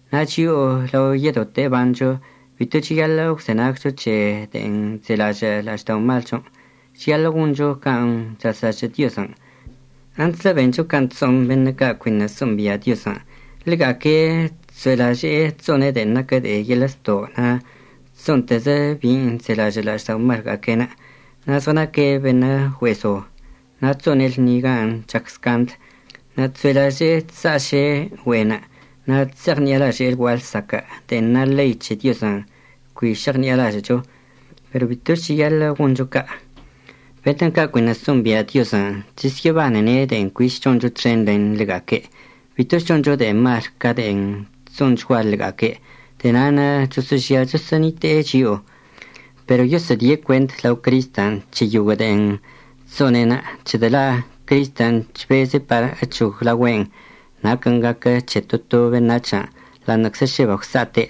Na' chio'o lao yedote əbancho bito cheyaḻə' əgwzenagcho c̱he de'en chzelažə' la'ažda'omalchon', cheyaḻə' goncho can' chazlažə' Diozən'. Antslə bencho can' chso'on beṉə' ca' cuiṉə' so'ombia' Diozən'. Ḻega'aque' chso'elaže'e chso'one' de'e naquə de'e yeḻə' zto' na' chso'onteze' bin' chzelažə' la'ažda'omalga'aque'enə', na' zɉənaque' beṉə' güe'e zo, na' chso'one' lṉi gan' chac scandl, na' chso'elaže'e chsa'aše' güe'enə', na' chse'eɉṉi'alaže'e lgua'a lsaquə' de'en na ḻei c̱he Diozən' cui šeɉṉi'alažə'əcho. Pero bitoch cheyaḻə' goncho ca'. Beṉə' ca' cuiṉə' so'ombia' Diozən' chesyə'əbanene' de'en cuich choncho txen len ḻega'aque'. Bitoch choncho de'e mal ca' de'en chso'onchgua ḻega'aque'. De'e na'anə' choso'ožia choso'onite'e chio'o. Pero yosə'ədie' cuent lao Cristən' c̱he yoguə' de'en chso'one'enə', c̱hedə' la' Cristən' chbeze' par əc̱hoglaogüe'en naquən' gaquə c̱he to to beṉac̱hən', ḻa'aṉə'əczə šə bagwsa'ate'.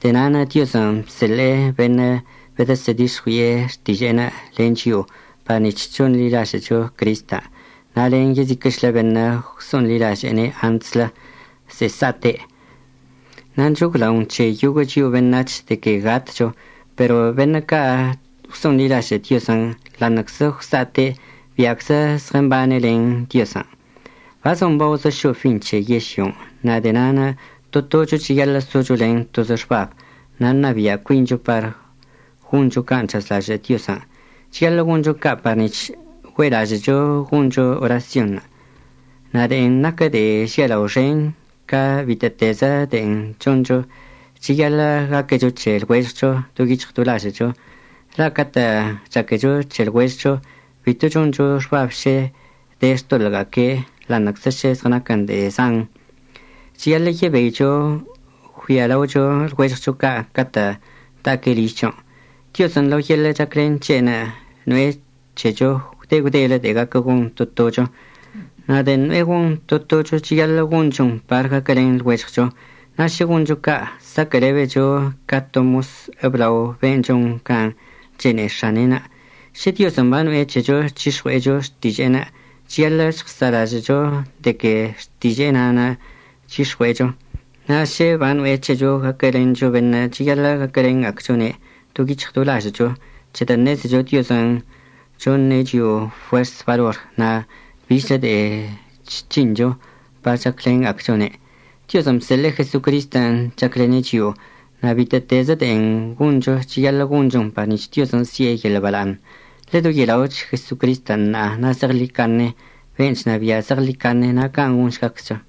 De'e na'anə' Diozən' bseḻe'e beṉə' bedəsə'ədix̱ɉui'e xtiže'enə' len chio'o par nic̱h chonḻilažə'əcho Cristən', na' len yeziquə'əchlə beṉə' gwso'onḻilaže'ene' antslə ze'e sa'ate'. Na' nchoglaon c̱he yoguə' chio'o beṉac̱h de que gatcho, pero beṉə' ca' gwso'onḻilažə' Diozən' ḻa'aṉə'əczə gwsa'ate', bia'aczə zɉəmbane' len Diozən'. Bazon baozə šo'o fin c̱he yežlyon', na' de'e na'anə' to tocho cheyaḻə' socho len tozə xbab na' ṉabia' cuincho par goncho can' chazlažə' Diozən'. Cheyaḻə' goncho ca' par nic̱h güe'elažə'əcho goncho orasyonṉə'. Na' de'en naquə de'e žialao xench ca bitə'ətezəchlə de'en choncho, cheyaḻə' gaquecho c̱he lɉuežɉcho do yic̱hɉ do lažə'əcho. La' catə' chaquecho c̱he lɉuežɉcho, bito choncho xbab šə de xtoḻə'əga'aque' ḻa'aṉə'əczə šə zɉənaquən de'e zan. Cheyaḻə' yebeicho əggüialaocho lɉuežɉcho ca' catə' da'aque' ližchon'. Diozən' lao yeḻə' chaclen c̱he'enə' no'e c̱hecho gwde gwdelə de'e gaquə gon to tocho. Na' de'en no'e gon to tocho cheyaḻə' gonchon par gaquəlen lɉuežɉcho. Na' šə goncho ca' saquə'əlebecho ca to mos əblao ben' chon can' chene'e x̱ane'enə'. Šə Diozən' bano'e c̱hecho c̱hix̱ɉue'echo xtiže'enə', cheyaḻə' žɉəsa'alažə'əcho de que xtiže'e na'anə' chyix̱ɉue'echo. Na' šə bano'e c̱hecho gaquəlencho beṉə', cheyaḻə' gaquəlenga'acchone' do yic̱hɉ do lažə'əcho c̱hedə' ṉezecho Diozən' choṉe' chio'o fuers balor na' bichlə de'e chc̱hincho par chaclenga'acchone'. Diozən' bseḻe'e Jesocristən' chaclene' chio'o, na' bitə'ətezə de'en goncho cheyaḻə' gonchon par nic̱h Diozən' si'e yeḻə' bala'aṉ. Ḻedoye'ela'och Jesocristən' ṉa'a na' zeɉḻicaṉe ben' chnabia' zeɉḻicaṉe. Na' can' gonšgaczcho.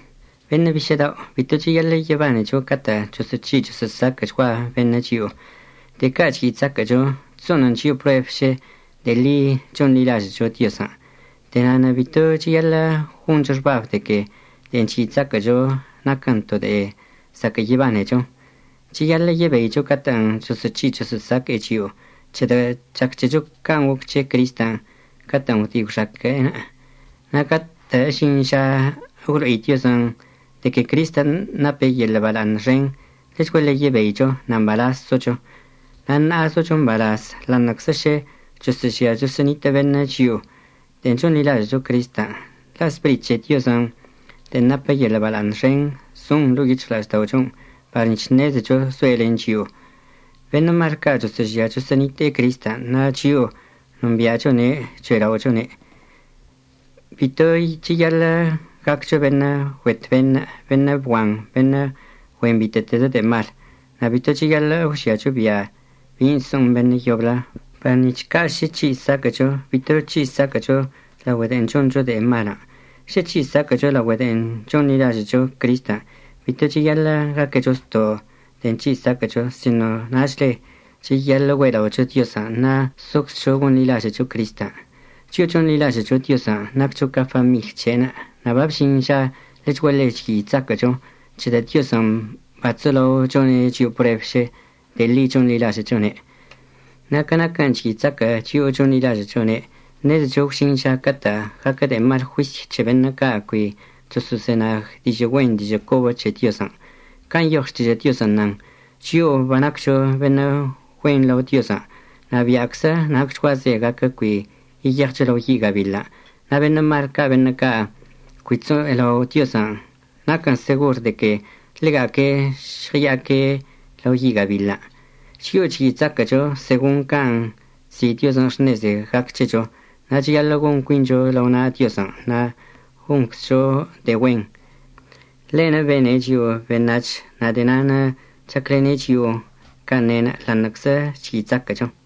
Beṉə' bišə' dao' bito cheyaḻə' yebanecho catə' choso'oc̱hi' choso'osaquə'əchgua beṉə' chio'o. De'e ca' chyi' chzaquə'əcho chso'onən chio'o prueb šə de'e ḻi chonḻilažə'əcho Diozən'. De'e na'anə' bito cheyaḻə' goncho xbab de que de'en chyi' chzaquə'əcho naquən to de'e zaquə' yebanecho. Cheyaḻə' yebeicho catə'ən choso'oc̱hi' choso'osaque'e chio'o c̱hedə' chac c̱hecho can' goc c̱he Cristən' catə'ən gwdi' gwxaque'enə'. Na' catə' əžin ža əgwlo'i Diozən' de que Cristən' nape' yeḻə' bala'aṉ xen, ḻechguaḻe yebeicho na' mbalaz socho. Na' ṉa'a zocho mbalaz ḻa'aṉə'əczə šə choso'ožia choso'onitə' beṉə' chio'o de'en chonḻilažə'əcho Cristən', la' Spirit c̱he Diozən' de'en napə yeḻə' bala'aṉ xen zon ḻo'o yic̱hɉla'ažda'ochon' par nic̱h ṉezecho zoe' len chio'o. Beṉə' mal ca' choso'ožia choso'onite'e Cristən', na' chio'o nombi'achone' cho'ela'ochone'. Bito cheyaḻə' gaccho beṉə' güet beṉə', beṉə' bguan, beṉə' güen bitə'ətezə de'e mal, na' bito cheyaḻə' əgwžiacho bia' bin' so'on beṉə' yoblə, par nic̱h ca' šə c̱hi' saquə'əcho bito c̱hi' saquə'əcho laogüe de'en choncho de'e malən'. Šə c̱hi' saquə'əcho laogüe de'en chonḻilažə'əcho Cristən' bito cheyaḻə' gaquecho zto' de'en c̱hi' saquə'əcho sino nachle cheyaḻə' güe'ela'ocho Diozən' na' soczcho gonḻilažə'əcho Cristən'. Chio'o chonḻilažə'əcho Diozən' naccho ca famiḻy c̱he'enə'. Na' babžin ža ḻechguaḻe chyi' chzaquə'əcho c̱hedə' Diozən' bachzolao chone' chio'o prueb šə de'e ḻi chonḻilažə'əchone'. Na' ca naquən' chyi' chzaquə' chio'o chonḻilažə'əchone', ṉezecho gwžin ža catə' gaquə de'e mal juisy c̱he beṉə' ca' cui choso'ozenag dižə' güen dižə' cobə c̱he Diozən'. Can' nyoɉ Xtižə' Diozən' nan: “Chio'o banaccho beṉə' güen lao Diozən' na' bia'aczə nacchguaze gaquə cui yeyeɉcho lao yi' gabiḻən', na' beṉə' mal ca' beṉə' ca' cui chso'elao' Diozən', naquən segor de que ḻega'aque' žɉəya'aque' lao yi' gabiḻən'.” Chio'o chyi' chzaquə'əcho segon can' chzi' Diozən' xṉeze gac c̱hecho, na' cheyaḻə' gon cuincho lao na' Diozən' na' gonczcho de'e güen. Ḻe'enə' bene' chio'o beṉac̱h, na' de'e na'anə' chaclene' chio'o can' ne'enə' ḻa'aṉə'əczə chyi' chzaquə'əcho.